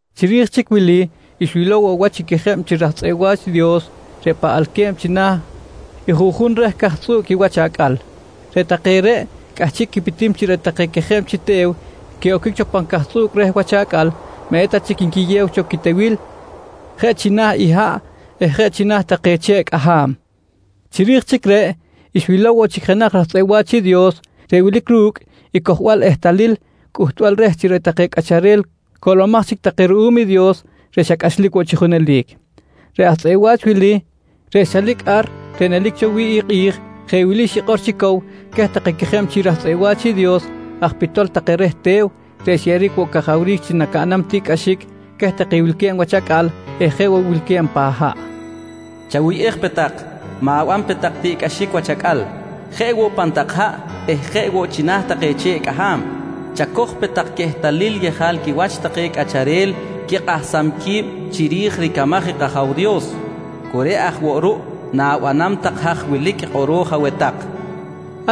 Chiri̱j chic wili, xwilow woꞌ wach i quejeb chi raj tzꞌeꞌ wa̱ch i Dios reꞌ paꞌalque̱b china̱ i juꞌjun reh ricaj tzꞌuꞌc i wach acꞌal. Reꞌ take reꞌ cꞌahchiꞌ quipitim chi reꞌ take quejeb chi te̱w quiꞌoquic cho pan cajtzꞌuꞌc reh wach acꞌal maꞌ eta chic nquiyew cho quitewil je china̱ i haꞌ eh jeꞌ china̱ take che̱ꞌ cꞌaham. Chiri̱j chic reꞌ, xwilow woꞌ chic jenaj raj tzꞌeꞌ wa̱ch i Dios reꞌ wilic ru̱cꞌ i cojbal ehtalil cꞌuhtbal reh chi reꞌ take cꞌacharel coꞌlomaj chic take ruꞌum i Dios reꞌ xa cꞌachlic woꞌ chi junelic. Reꞌ aj tzꞌeꞌ wa̱ch wili reꞌ xchalic ar reꞌ nelic cho wi̱ꞌ i kꞌi̱j jeꞌ wili xikꞌor chi cow queh take quejeb chi rich aj tzꞌeꞌ wa̱ch i Dios aj pitol take reh te̱w reꞌ xyeꞌeric woꞌ cajawric chi nacaꞌnam tiꞌcꞌaxic queh take wilque̱b wach acꞌal eh jeꞌ woꞌ wilque̱b pan haꞌ: «Chawuyꞌej pe tak, ma̱ban pe tak tiꞌcꞌaxic wach acꞌal, jeꞌ woꞌ pan tak haꞌ eh jeꞌ woꞌ china̱ take che̱ꞌ cꞌaham. Chacoj pe tak quehtalil yejal quiwach take cꞌacharel quikꞌahsam qui̱b chiri̱j i ricamaj i kAja̱w Dios, cu reꞌ aj woꞌ ruꞌ na̱banam tak haj wilic kꞌoro̱j aweh tak, nqui queh.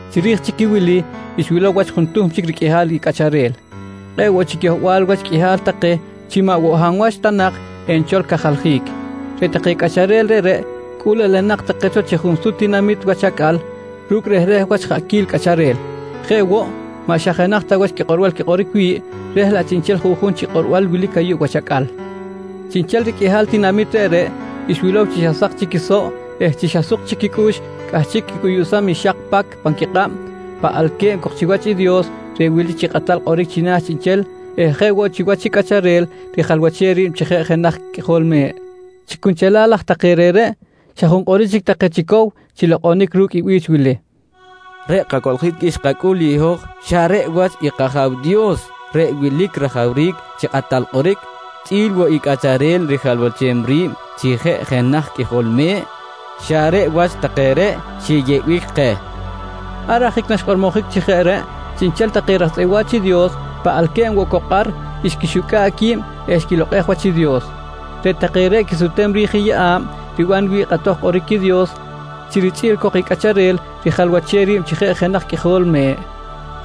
Chiri̱j chic i wili, xwilow wach juntuhm chic riqꞌuihal cꞌacharel. Kꞌe̱ꞌ woꞌ chic yohbal wach qꞌuihal take chi maꞌ woꞌ hab wach ta nak enchol cajaljic. Reꞌ take cꞌacharel reꞌreꞌ, cꞌul elenak take cho chi junsut tinamit wach acꞌal ru̱cꞌ rehreh wach jaꞌquil cꞌacharel. Jeꞌ woꞌ, maꞌ xa jenaj ta wach quikꞌorbal quikꞌoric wi̱ꞌ reh laꞌ chiꞌnchel juꞌjun chi kꞌorbal wilic ayuꞌ wach acꞌal. Chiꞌnchel riqꞌuihal tinamit reꞌreꞌ xwilow chi xa sak chic quisoꞌ eh chi xa suk chic quicꞌux cꞌahchiꞌ quicꞌuyuꞌsam i xak pacꞌ pan quikꞌab paꞌalque̱b cok chiwach i Dios reꞌ wilic chi kꞌatal kꞌoric china̱ chiꞌnchel eh jeꞌ woꞌ chiwach i Cꞌacharel rijalwachem ri̱b chi jenaj Qꞌuijol Me̱ꞌ. Chi cunchelal aj take reꞌreꞌ, xa junkꞌoric chic take chi cow chi lokꞌonic ru̱cꞌ i bi̱ch wili: “Reꞌ kacoꞌljic xkacꞌul i hoj xa reꞌ wach i kAja̱w Dios reꞌ wilic rajawric chi kꞌatal kꞌoric chꞌi̱l woꞌ i Cꞌacharel rijalwachem ri̱b chi jeꞌ jenaj Qꞌuijol Me̱ꞌ, xa reꞌ wach take reꞌ xiyeꞌbic keh, nqui take. Ar ajic naxkꞌormojic chi jeꞌ reꞌ, chiꞌnchel take raj tzꞌeꞌ wa̱ch i Dios paꞌalque̱b woꞌ cok ar xquixucꞌa̱ꞌ qui̱b eh xquilokꞌej wach i Dios. Reꞌ take reꞌ quisutem ri̱j i yeꞌa̱b riban wi̱ꞌ kꞌatoj kꞌoric i Dios chi richꞌi̱l cok i Cꞌacharel rijalwachem ri̱b chi jenaj Qꞌuijol Me̱ꞌ.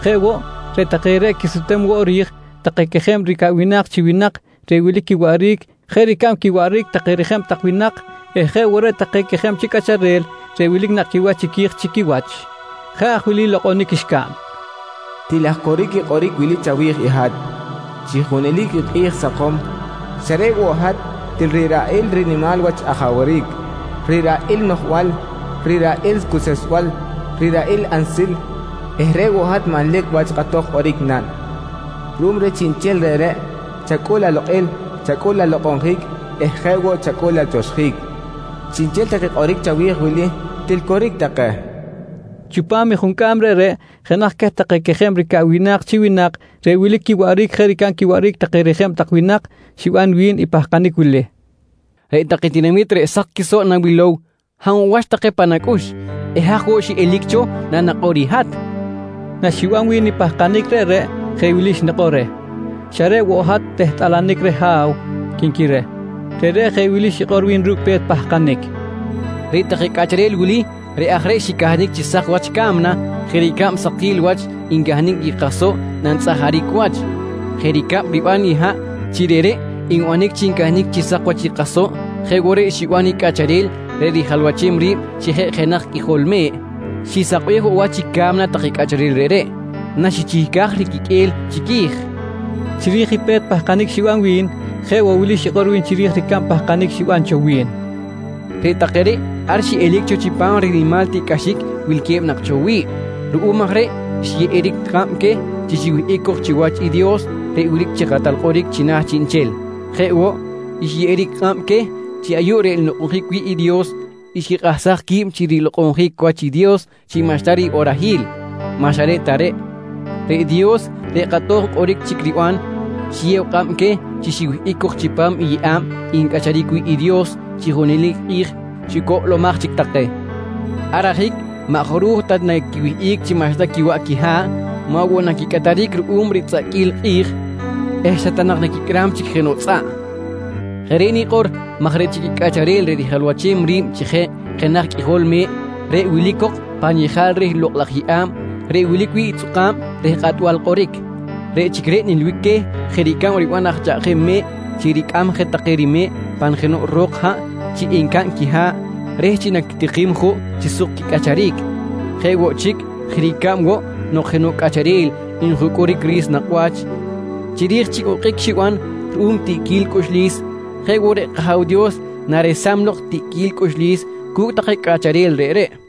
Jeꞌ woꞌ, reꞌ take reꞌ quisutem woꞌ ri̱j take quejeb ricaꞌwinak chi winak reꞌ wilic quiwaꞌric jeꞌ ricab quiwaꞌric take rijeb tak winak eh jeꞌ woꞌ reꞌ take quejeb chi cꞌacharel reꞌ wilic nakꞌ quiwach chiqui̱j chi quiwach. Jeꞌ aj wili lokꞌonic xcaꞌn: “Til aj coric i kꞌoric wili chawi̱j i hat: Chi junelic i kꞌi̱j sakom xa reꞌ woꞌ hat til riraꞌil rinimal wach ajawric, riraꞌil noꞌjbal, riraꞌil cuseꞌsbal, riraꞌil ansil eh reꞌ woꞌ hat manlic wach kꞌatoj kꞌoric naꞌn. Ruꞌum reh chiꞌnchel reꞌreꞌ, chacꞌul alokꞌil, chacꞌul alokꞌonjic eh jeꞌ woꞌ chacꞌul atioxjic. Chiꞌnchel take kꞌoric chawi̱j wili, til coric take, nqui take. Chipam i juncꞌam reꞌreꞌ jenaj queh take quejeb ricaꞌwinak chi winak reꞌ wilic quiwaꞌric jeꞌ ricab quiwaꞌric take rijeb tak winak xiban wi̱n i pahkanic wili: «Reꞌ take tinamit reꞌ sak quisoꞌ nawilow, hab woꞌ wach take pan acꞌux eh haj woꞌ xiꞌelic cho nanakꞌor i hat? nqui wi̱n. Naxiban wi̱n i pahkanic reꞌreꞌ, jeꞌ wili xnikꞌor reh: «Xa reꞌ woꞌ hat tehtꞌalanic reh ha̱w, quinqui reh. Reꞌreꞌ jeꞌ wili xikꞌor wi̱n ru̱cꞌ pe̱t pahkanic: «Reꞌ take cꞌacharel wili reꞌ aj reꞌ xicahnic chi sak wach i ca̱mna jeꞌ ricab sakil wach ncahnic i kasoꞌ nantzꞌajaric wach. Jeꞌ ricab riban i haꞌ chi reꞌreꞌ nbanic chi ncahnic chi sak wach i kasoꞌ jeꞌ woꞌ reꞌ xiban i Cꞌacharel reꞌ rijalwachem ri̱b chi jeꞌ jenaj Qꞌuijol Me̱ꞌ, xisakbej woꞌ wach i ca̱mna take cꞌacharel reꞌreꞌ naxichihcaj riquiqꞌue̱l chiqui̱j, nqui wi̱n. Chiri̱j i pe̱t pahkanic xiban wi̱n, jeꞌ woꞌ wili xikꞌor wi̱n chiri̱j i ricab pahkanic xiban cho wi̱n: «Reꞌ take reꞌ ar xiꞌelic cho chipam rinimal tiꞌcꞌaxic wilque̱b nak cho wi̱ꞌ. Ruꞌum aj reꞌ xyeꞌeric kꞌab queh chi xiwihꞌic cok chiwach i Dios reꞌ wilic chi kꞌatal kꞌoric china̱ chiꞌnchel. Jeꞌ woꞌ, xyeꞌeric kꞌab queh chi ayuꞌ reꞌ nlokꞌonjic wi̱ꞌ i Dios xquikꞌahsaj qui̱b chi rilokꞌonjic wach i Dios chi maꞌxta riꞌorahil. Maꞌ xa reꞌ ta reꞌ, reꞌ Dios reꞌ kꞌatoj kꞌoric chic riban, xiyew kꞌab queh chi xiwihꞌic cok chipam i yeꞌa̱b ncꞌacharic wi̱ꞌ i Dios chi junelic i kꞌi̱j chi coꞌlomaj chic take. Ar ajic maꞌ jaruj ta naquiwihꞌic chi maꞌxta quiwaꞌ quiha̱ꞌ, maꞌ woꞌ naquicꞌataric ruꞌum ritzꞌaꞌquil i kꞌi̱j eh xa ta nak naquicꞌram chic jenoꞌ tzꞌaꞌ. Jeꞌ reꞌ nikꞌor maj reꞌ chic i Cꞌacharel reꞌ rijalwachem ri̱b chi jeꞌ jenaj Qꞌuijol Me̱ꞌ, reꞌ wilic woꞌ cok pan yejal reh lokꞌ laj yeꞌa̱b reꞌ wilic wi̱ꞌ i tzꞌuka̱b reh kꞌatbal kꞌoric, reꞌ chic reꞌ nilbic queh, jeꞌ ricab riban aj chaꞌjem me̱ꞌ chi ricꞌam je take rime̱ꞌ pan jenoꞌ ro̱k haꞌ chi encaꞌn quiha̱ꞌ reh chi naquitikim juꞌ chi suk quicꞌacharic. Jeꞌ woꞌ chic, jeꞌ ricab woꞌ nok jenoꞌ cꞌacharel njucꞌuric ri̱s nakꞌ wach chiri̱j chi okꞌic xiban ruꞌum tiꞌquil cꞌuxlis, jeꞌ woꞌ reꞌ kAja̱w Dios naresam lok tiꞌquil cꞌuxlis cu̱cꞌ take cꞌacharel reꞌreꞌ, nqui wi̱n.